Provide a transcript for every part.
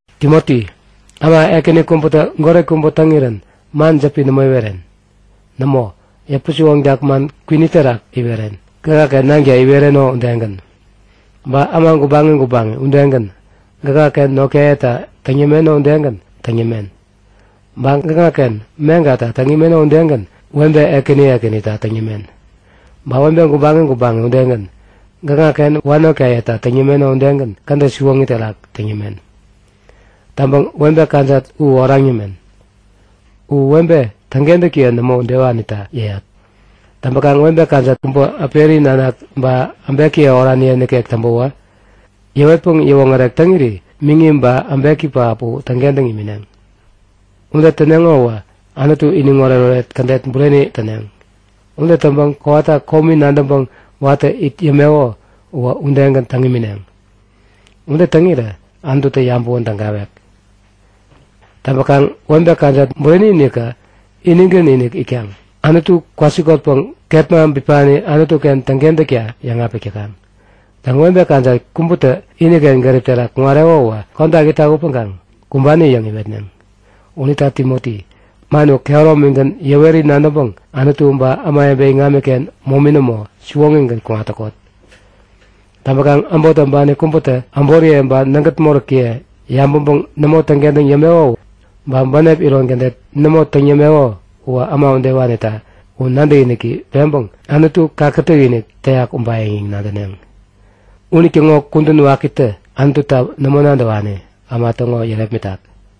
Timoti, äma ekäni kubätä goret kubä täŋirän man jäpi nämo iweren. Nämo, yäpä-siwoŋtak man kwini terak iweren, gäkŋaken nanka iwereno udegän. Ba äma gubaŋi gubaŋi udegän, gäkŋaken notkayeta täŋ yämeno udegän täŋ yämen. Ba gäkŋaken meŋkata täŋ imeno udegän webe ekäni ekänita täŋ yämen. Ba webe gubaŋi gubaŋi udegän, gäkŋaken wanotkayeta täŋ yämeno udegän kädet siwoŋi terak täŋ yämen. Täŋpäŋ webe kajat u oraŋ yämen. U webe täŋkentäkiye nämo udewanita yäyat. Täŋpäkaŋ webe kajat kubä äperiye nanak ba äbekiye oraniye nikek täŋpäwä, yäwetpäŋ yäwoŋärek täŋiri miŋi ba äbeki pähap u täŋkentäŋ imineŋ. Ude täneŋo uwä Anutu iniŋ oretoret kädet bureni täneŋ. Ude täŋpäŋ kowata komi nadäŋpäŋ watä it yämeko uwä udegän täŋ imineŋ. Ude täŋirä Anututä yabäwän tägawek. Täŋpäkaŋ webe kajat bureni-inikä, inigän-inik itkaŋ Anutu kwasikotpäŋ kepma bipani Anutu-ken täŋkentäkta yäŋapik täkaŋ. Täŋ, webe kajat kubätä iniken gärip terak kuŋareko uwä kodak itak upäŋkaŋ kumbani yäŋ iwetneŋ. Unita Timoti, man uwä kehäromigän yäweri nadäŋpäŋ Anutu ba ämawebe iŋamiken momi nämo, siwoŋigän kuŋat täkot. Täŋpäkaŋ äbot täŋpani kubätä äboriye ba nägät moräkiye yabäŋpäŋ nämo täŋkentäŋ yämeko, ba bänep iron kädet nämo täŋ yämeko uwä äma udewanita u nadäkiniki peŋpäŋ Anutu kakätäk-inik täyak ubayäŋ yäŋ nadäneŋ. Unitäŋo kudän wakitä Anututa nämo nadäwani äma täŋo yärepmitak.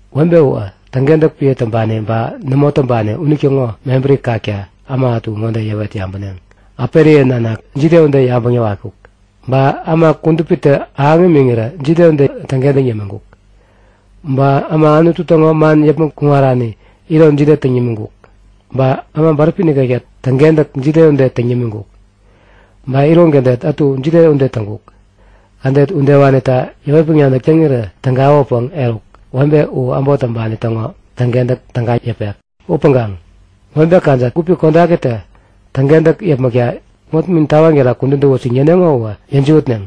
Webe uwä täŋkentäk piä täŋpani ba nämo täŋpani unitäŋo mebäri kakta äma ätu ŋode yäwet yabäneŋ; Äperiye nanak jide ude yabäŋ yäwatkuk? Ba äma kudupitä ahäŋ imiŋirä jide ude täŋkentäŋ yämiŋkuk? Ba äma Anutu täŋo man yäpmäŋ kuŋarani iron jide täŋ yämiŋkuk? Ba äma bäräpi nikekta täŋkentäk jide ude täŋ yämiŋkuk? Ba iron kädet ätu jide ude täŋkuk? Kädet udewanita yäwetpäŋ nadäk täŋirä tägawäpäŋ eruk, webe u äbot täŋpani täŋo täŋkentäk täga yäpek. Upäŋkaŋ webe kajat gupi kodakitä täŋkentäk yäpmäkta wäpnin tawaŋ terak kudän täwut yäŋ yäneŋo uwä yäjiwätneŋ.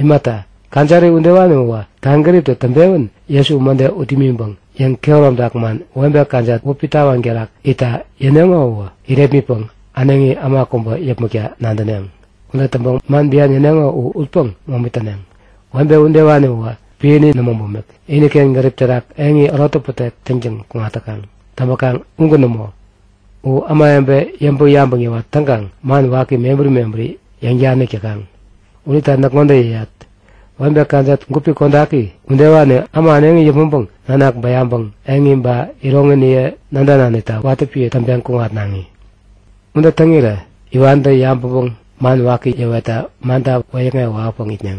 Imata, kajari udewani uwä kaŋgäriptä täŋpewän Jesu mäde ut imiŋpäŋ yäŋkehäromtak man webe kajat wäpi tawaŋ terak itta yäneŋo u irepmitpäŋ äneŋi äma kubä yäpmäkta nadäneŋ. Ude täŋpäŋ man bian yäneŋo u utpäŋ momi täneŋ. Webe udewani uwä piäni nämo bumik, iniken gärip terak eŋi äro täpätek täŋtäŋ kuŋat täkaŋ. Täŋpäkaŋ ugän nämo. U ämawebe yäŋpäŋ-yabäŋ yäwat täŋkaŋ man waki mebäri mebäri yäŋ-danik täkaŋ. Unita näk ŋode yäyat; Webe kajat gupi kodaki udewani äma äneŋi yäpmäŋpäŋ nanak bäyaŋpäŋ eŋi ba iroŋiniye nädananita watä piä täŋpeŋ kuŋatnaŋi. Ude täŋirä iwantä yabäŋpäŋ man waki yäwetta manta wäyäkŋewä wawäpäŋ itneŋ.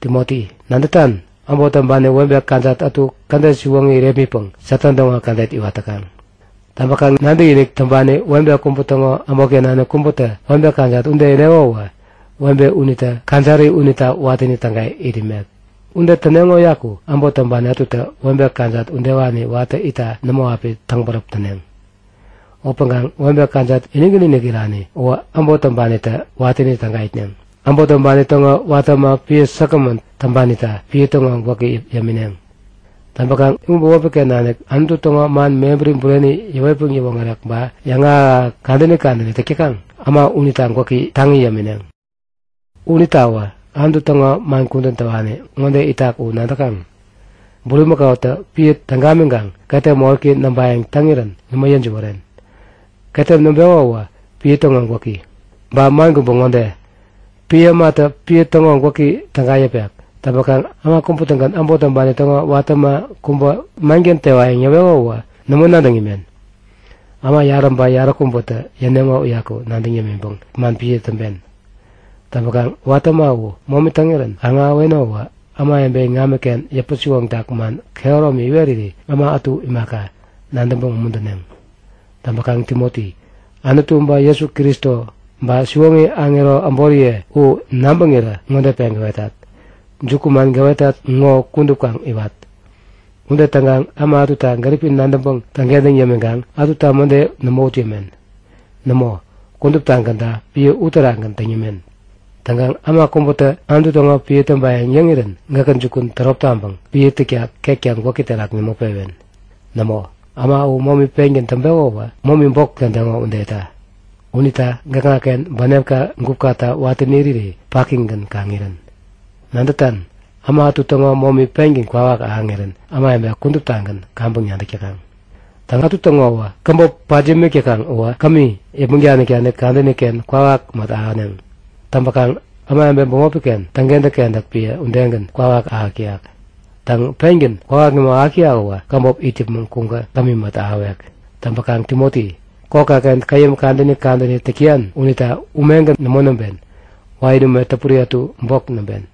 Timoti, nadätan? Äbot täŋpani webe kajat ätu kädet siwoŋi irepmitpäŋ Satan täŋo kädet iwat täkaŋ. Täŋpäkaŋ nadäkinik täŋpani webe kubä täŋo äbotken nanik kubätä webe kajat ude ireko uwä, webe unitä kajari unita watäni täga it imek. Ude täneŋo uyaku äbot täŋpani ätutä webe kajat udewani watäni itta nämo api täŋbäräp täneŋ. Upäŋkaŋ webe kajat inigän-inik irani uwä, äbot täŋpanitä watäni täga itneŋ. Äbot täŋpani täŋo watä äma piä säkgämän täŋpanita piä täŋo gwäki yämineŋ. Täŋpäkaŋ u bämopi-ken nanik Anutu täŋo man mebäri bureni yäwetpäŋ yäwoŋärek ba yäŋahäk-ahäk kadäni kadäni täk täkaŋ äma unita gwäki taŋi yämineŋ. Unitawä Anutu täŋo man kudän täwani ŋode itak u nadäkaŋ; Bulimäkautä piä täŋ gamiŋkaŋ ketem moräki näŋpayäŋ täŋirän nämo yäjiwären. Ketem näŋpeko uwä piä täŋo gwäki. Ba man kubä ŋode; Piä ämatä piä täŋo gwäki täga yäpek. Täŋpäkaŋ äma kubä-tägän äbot täŋpani täŋo watä äma kubä manken tewa yäŋ yäweko uwä nämo nadäŋ imen. Äma yarä ba yaräkubätä yäneŋo uyaku nadäŋ yämiŋpäŋ man piä täŋpen. Täŋpäkaŋ watä äma u momi täŋirän kaŋ-ahäweno uwä ämawebe iŋamiken yäpä-siwoŋtak man kehäromi iweriri äma ätu imaka, nadäŋpäŋ umuntäneŋ. Täŋpäkaŋ Timoti, Anutu, ba Jesu Kristo ba siwoŋi aŋero äboriye u nabäŋirä ŋode peŋ gäwetat; Jukuman gäwetat ŋo kudup kaŋ iwat. Ude täŋkaŋ äma ätuta gäripi nadäŋpäŋ täŋkentäŋ yämiŋkaŋ ätuta mäde nämo ut yämen. Nämo, kuduptagänta piä uterakgän täŋ yämen. Täŋkaŋ äma kubätä Anutu täŋo piä täŋpayäŋ yäŋirän gäkä jukun tärop taŋpäŋ piä täkta ketka gwäki terak nämo pewen. Nämo, äma u momi pengän täŋpeko uwä momi bok tädeŋo udeta. Unita gäkŋaken bänepka gupkata watäni iriri pakigän kaŋ irän. Nadätan? Äma ätu täŋo momi pengän kwawak ahäŋirän ämawebe kuduptagän kaŋpäŋ nadäk täkaŋ. Täŋ, ätu täŋo uwä käbop pat yämik täkaŋ uwä kämi yäpmäŋ danik-danik kadäni-ken kwawak mät ahäneŋ. Täŋpäkaŋ ämawebe bämopi-ken täŋkentäk-kentäk piä udegän kwawak ahäk täyak. Täŋ, pengän kwawak nämo ahäk täyak uwä käbop it yäpmäŋ kuŋkä kämi mät ahäwek. Täŋpäkaŋ Timoti, kokka-ken käyäm kadäni kadäni täk täyan unita umegän nämo näŋpen. Wain ume täpuri ätu bok näŋpen.